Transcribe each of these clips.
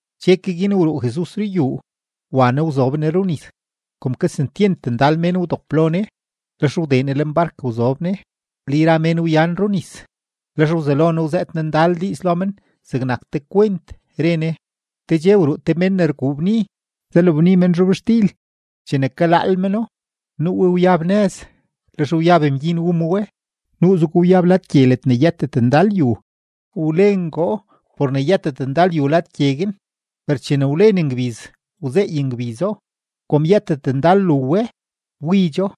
Dxe ke guin wruu Jesus ruyuu, wa Ne wzob Ne runis. Kom kesentyent ndal mén wdop lo Ne, lex wdee Ne lenbark wzob Ne, le yra mén wyan runis. Lex wzelo Ne wzëët Ne ndal diiz lo men zegnak te kwent, re Ne: ―Te dxe wruu te mén ne rguu bni, zalabni men zhobxtil. Chene kalaal meno, nuu we wyab nëz; lex wyab mgyin wu ma we. Nuuzego wyab lad gye ledne yëtet ndal yu; wlengoo por ne yëtet ndal yu lad gye guin. Per chene wlen ngbiz, wzeey ngbizo; kom yëtet ndal lu we, wbidxo.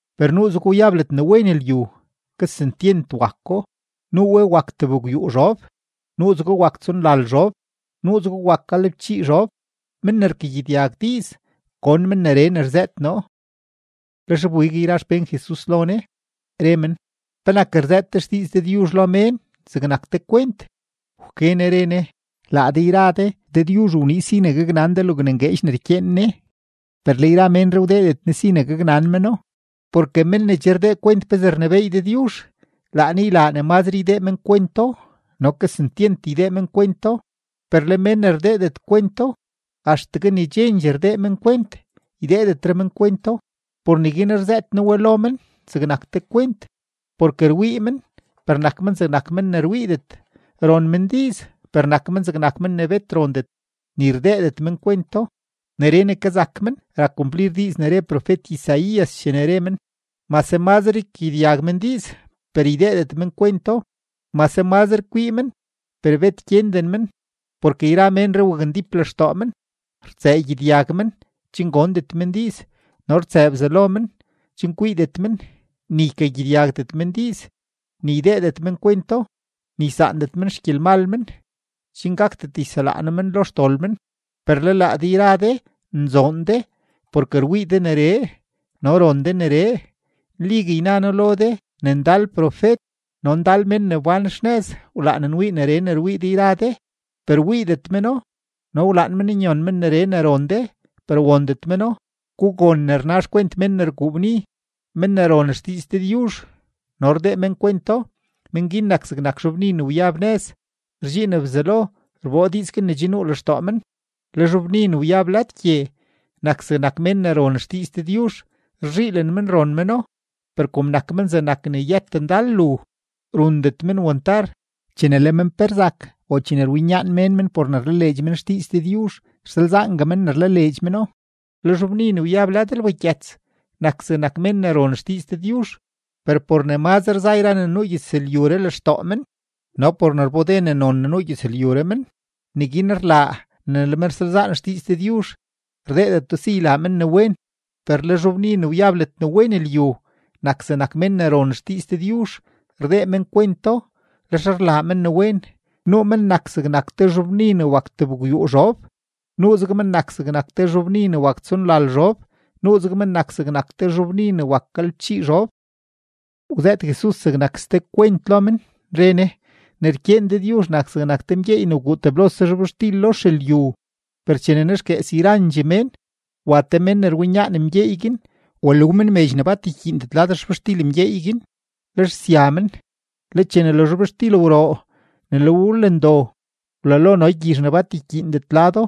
Per nuuzego wyab ledne wen lyu, kesentyent wako; nuu we wak tebgwyuu zhob, nuuzego wak tsonlal zhob, nuuzego wak galebchii zhob. Men ne rkagyedyag diiz, gon men neree ne rzëët noo. Lex wbig yra xpén Jesus lo Ne, re men: ―¿Penak rzëët de xdiiz Dëdyuzh lo mén zegnak te kwent? Wke Ne re Ne: ―Laa de yra de, Dëdyuzh wniiz si ne gaknan de logne ngueedx ne rkyeen Ne, per le yra ménree wdeedet Ne si ne gaknan meno. Porke men ne che rdee kwent pezee rnebééy Dëdyuzh, laa Ne ylaa ne mazre ydee men kwento no kesentyent ydee men kwento. Per le men ne rdeedet kwento, axtegue ne chendxee rdee men kwent, ydeedetre men kwento. Por neguin rzëët noo we lo men zegnak te kwent, porke rwii men, per nak men zegnak mén ne rwiidet; ron men diiz, per nak men zegnak mén ne bet rondet, ni rdeedet men kwento. Neree ne kazak men rak kumplir diiz ne re profet-Isaías chene re men: Mase mazre ykagyedyag men diiz, per ydeedet men kwento; mase mazre kwii men, per bet gyenden men. Porke yra ménree wakndíp lextoo men; rtsëë gyedyag men chen gondet men diiz, no rtsëë bzalo men, chen kwiidet men, ni ykagyedyagdet men diiz, ni ydeedet men kwento, ni ysaandet men xgyelmal men chen gakdet yselaa noo men lo xdol men. ’Per le laa de yra de nzoon de, porke rwii de neree no ron de neree. Nligue yna noo lo de ne ndal profet no ndal mén ne wbán xnëz wlaan nwii neree ne rwii de yra de, per wiidet meno, no wlaan men nyon men neree ne ron de, per wondet meno. ’Gugon ne rna xkwent mén ne rguu bni. Men ne ron xdiiz Dëdyuzh no rdeedet men kwento, mén guin nak zegnak zhobbni ne wyab nëz; rdxiin Bzelo rboo diiz guin ne che nuu lextoo men. Le zhobbni ne wyab lad gye nak zegnak mén ne ron xdiiz Dëdyuzh; rzhiilen men ron meno, per kom nak men zegnak ne yëtet ndal lu, rundet men wantar; chene le men pe rzak o chene rwinyaan mén men por ne rlaleedx men xdiiz Dëdyuzh, rsalzaangue men ne rlaleedx meno. Le zhobbni ne wyab lad lbagyëts nak zegnak mén ne ron xdiiz Dëdyuzh, per por ne mazre za yra ne nuu gyëzlyuree lextoo men no por ne rbode ne non ne nuu gyëzlyuree men, neguin rlaa ne le men rsalzaan xdiiz Dëdyuzh, rdeedeto si ylaa men ne wen. Per le zhobbni ne wyab ledne wen lyu, nak zegnak mén ne ron xdiiz Dëdyuzh, rdee men kwento, lex rlaa men ne wen. Nuu men nak zegnak te zhobbni ne wak tebgwyuu zhob, nuuzeg men nak zegnak te zhobbni ne wak tsonlal zhob, nuuzeg men nak zegnak te zhobbni ne wak galebchii zhob. Wzëët Jesus zegnak ste kwent lo men, re Ne: ―Ne rkyeen Dëdyuzh nak zegnak te mgyeey ne wguu teblose zhobxtil lo xelyu. Per chene nexguees yrandxee mén, wa te mén ne rwinyaan mgyeey guin walu men medx ne bat rkyiindet lad xzhobxtil mgyeey guin, lex sya men. Le chene le zhobxtil wroo ne le we wlen do, wlalo no gyizh ne bat rkyiindet lado.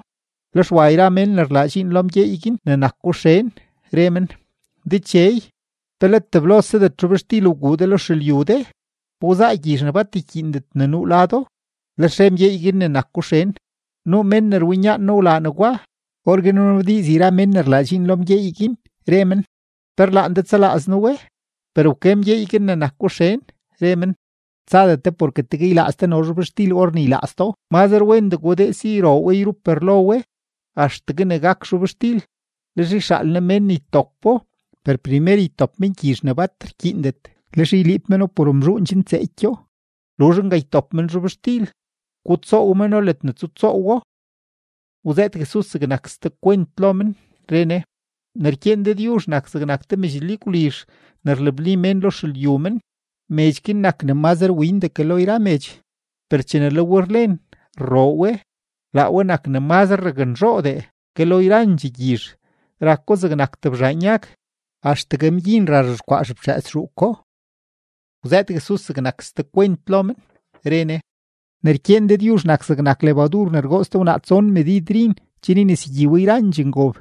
Lex wa yra mén ne rlaa dxiin lo mgyeey guin ne nako xen, re men: “Dechey, ¿pe let teblosedet zhobxtil wguu de lo xelyu de? ¿Pa wzaa gyizh ne bat rkyiindet ne nuu lado?” Lex re mgyeey guin ne nako xen: “Nuu mén ne rwinyaan noo wlaa negwa.” Orguin wnabdiiz yra mén guin ne rlaa dxiin lo mgyeey guin, re men: “¿Pe rlaan de tsalaaz noo we?” Per wke mgyeey guin ne nako xen, re men: “Tsadet de porke tegue ylaaz de no zhobxtil or ne ylaaz do. Mazre wendee gudee si yroo we yrup rlo we axtegue ne gak zhobxtil; lex yxaal noo mén ne ytopo. Per primer ytop men gyizh ne bat rkyiindet, lex yliib meno por mzhuun chen tseekyo; luzh nga, ytop men zhobxtil, gutsoow meno ledne tsutsoowo.” Wzëët Jesus zegnak ste kwent lo men, re Ne: ―Ne rkyeen Dëdyuzh nak zegnak te medx lyagwlizh ne rlabni mén lo xelyu mén. Medx guin nak ne mazre windee ke lo yra medx, per chene le we rlen rroo we, laa we nak ne mazre raknzhoodee ke lo yrandxee gyizh; rako zegnak tebzhaan yag, axtegue mgyin ra rzhexkwaa xeftxëës zhuuko. Wzëët Jesus zegnak ste kwent lo men, re Ne: ―Ne rkyeen Dëdyuzh nak zegnak lebadur ne rgoots te wnaa tson medid rin chen ynesegyi we yrandxee ngob.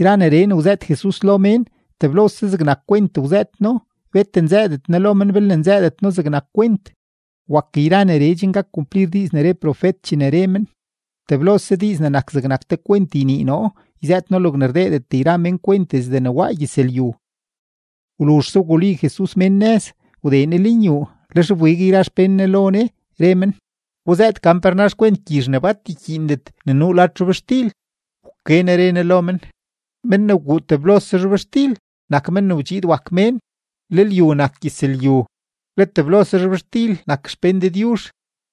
Yra neree ne wzëët Jesus lo mén, teblose zegnak kwent wzëët No; bet nzëëdet Ne lo men belne nzëëdet No zegnak kwent. Wak yra neree chen gak kumplir diiz ne re profet chene re men: Teblose diiz ne nak zegnak te kwent ynii noo yzëët noo logne rdeedet yra mén kwent desde ne waa gyëzlyu. Wluzhse wguli Jesus mén nëz, wdee Ne lenyuu; lex wbig yra xpén Ne lo Ne, re men: ―Guzëët gan pe rna xkwent gyizh ne bat rkyiindet ne nuu lad zhobxtil. Wke Ne re Ne lo men: ―Mén ne wguu teblose zhobxtil nak Men ne wdxiid wak Mén, le lyu nak gyëzlyu, le teblose zhobxtil nak xpén Dëdyuzh,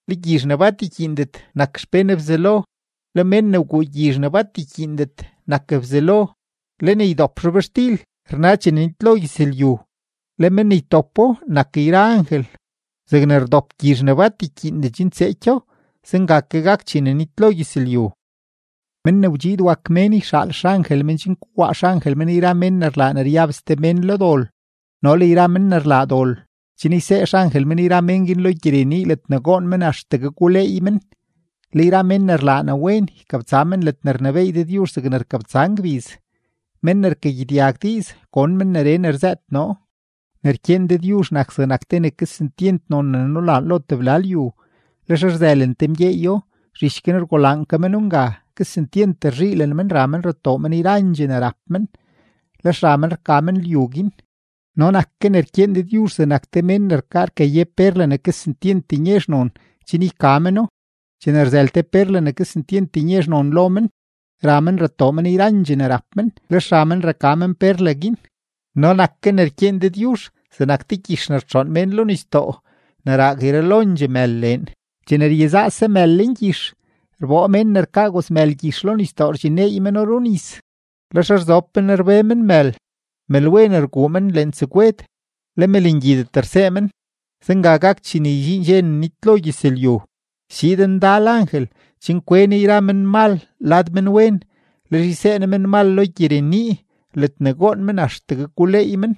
le gyizh ne bat rkyiindet nak xpén Bzelo, le mén ne wguu gyizh ne bat rkyiindet nak Bzelo, le ne ydop zhobxtil rna chene nitlo gyëzlyu, le mén ne ytopo nak yra angel. Zegne rdop gyizh ne bat rkyiindet chen tseekyo, zenga ke gak chene nitlo gyëzlyu. Men ne wdxiid wak Mén yxaal men xangel men chen kowaa xangel men yra mén ne rlaa ne ryab ste mén lo dol no le yra mén ne rlaa dol, chen ysee angel yra men guin lo gyirenii ledne goon men axtegue guleey men. Le yra mén ne rlaa ne wen, ykabtsa men ledne rnebééy Dëdyuzh zegne rkabtsa ngbiz. Men ne rkagyedyag diiz, gon men neree ne rzëët noo. ’Ne rkyeen Dëdyuzh nak zegnak te ne kesentyent non ne nulaan lo tebla lyu. Lex rzëlen te mgyeeyo, zhich guin rgulaan meno nga ke; kesentyent rzhiilen men, ra men ratoo men yrandxee ne rap men, lex ra men raka men lyu guin. ’No nak ke ne rkyeen Dëdyuzh zegnak te mén ne rkaa rkaye perla ne kesentyent nyezh non, chen yka meno. Chene rzël te perla ne kesentyent nyezh non lo men, ra men ratoo men yrandxee ne rap men, lex ra men raka men perla guin. ’No nak ke ne rkyeen Dëdyuzh zegnak te gyix ne rtxoon mén lo nisdoo ne raag yralondxee mël leen. Chene ryezaase mël lengyix, rboo mén ne rkaa gozmël gyix lo nisdoo rdxinneey meno runis. Lex rzob men rbe men mël; mëlwen rguu men lentsegwed, le mëlngyidet rsee men. Zenga gak chene ydxiin dxe ne nitlo gyëzlyu. Schiid ndal angel chen kwe ne yra menmal lad menwen. Lex ysee ne menmal lo gyirenii ledne goon men axtegue guleey men.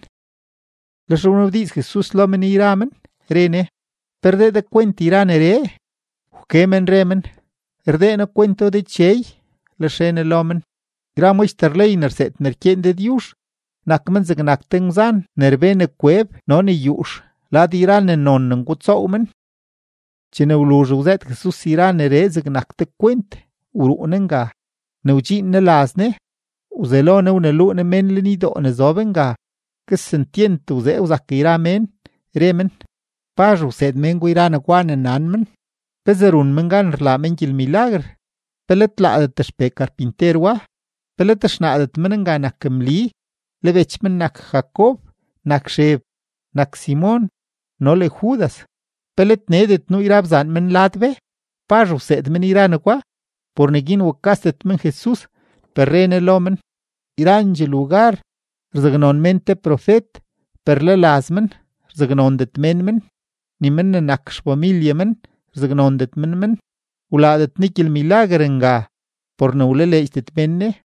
Lex wnabdiiz Jesus lo men yra men, re Ne: ―¿Pe rdee de kwent yra neree? Wke men re men: ―Rdee noo kwento, Dechey. Lex re Ne lo men: ―Yra maxter ley ne rseed ne rkyeen Dëdyuzh, nak men zegnak te ngwzan ne rbe ne kweb no le ne yuux lad yra ne non ne ngutsoow men. Chene wluzh wzëët Jesus yra neree zegnak te kwent, wruu Ne nga. Ne wdxiin Ne laz Ne, wzelo Ne wneluu Ne mén lenydoo ne zob nga. Kesentyent wzee wzak yra mén, re men: ―¿Pazh wseed mén gwa yra negwa ne nan men? ¿Pezee run men gan rlaa men gyelmilaguer? ¿Pe let laadet xpee karpinter wa? ¿Pe let xnaadet men nga nak Mli, le bech men nak Jacob, nak Xeb, nak Simon, no le Judas? ¿Pe let needet nuu yra bzaan men lad be? ¿Pazh wseed men yra negwa? Por neguin wukasdet men Jesus, per re Ne lo men: ―Yrandxee lugar rzaknon mén te profet, per le laz men rzaknondet mén men, ni men ne nak xfamilye men rzaknondet men men. Wlaadet Ne ndal gyelmilaguer nga por ne wlaleedxdet mén Ne.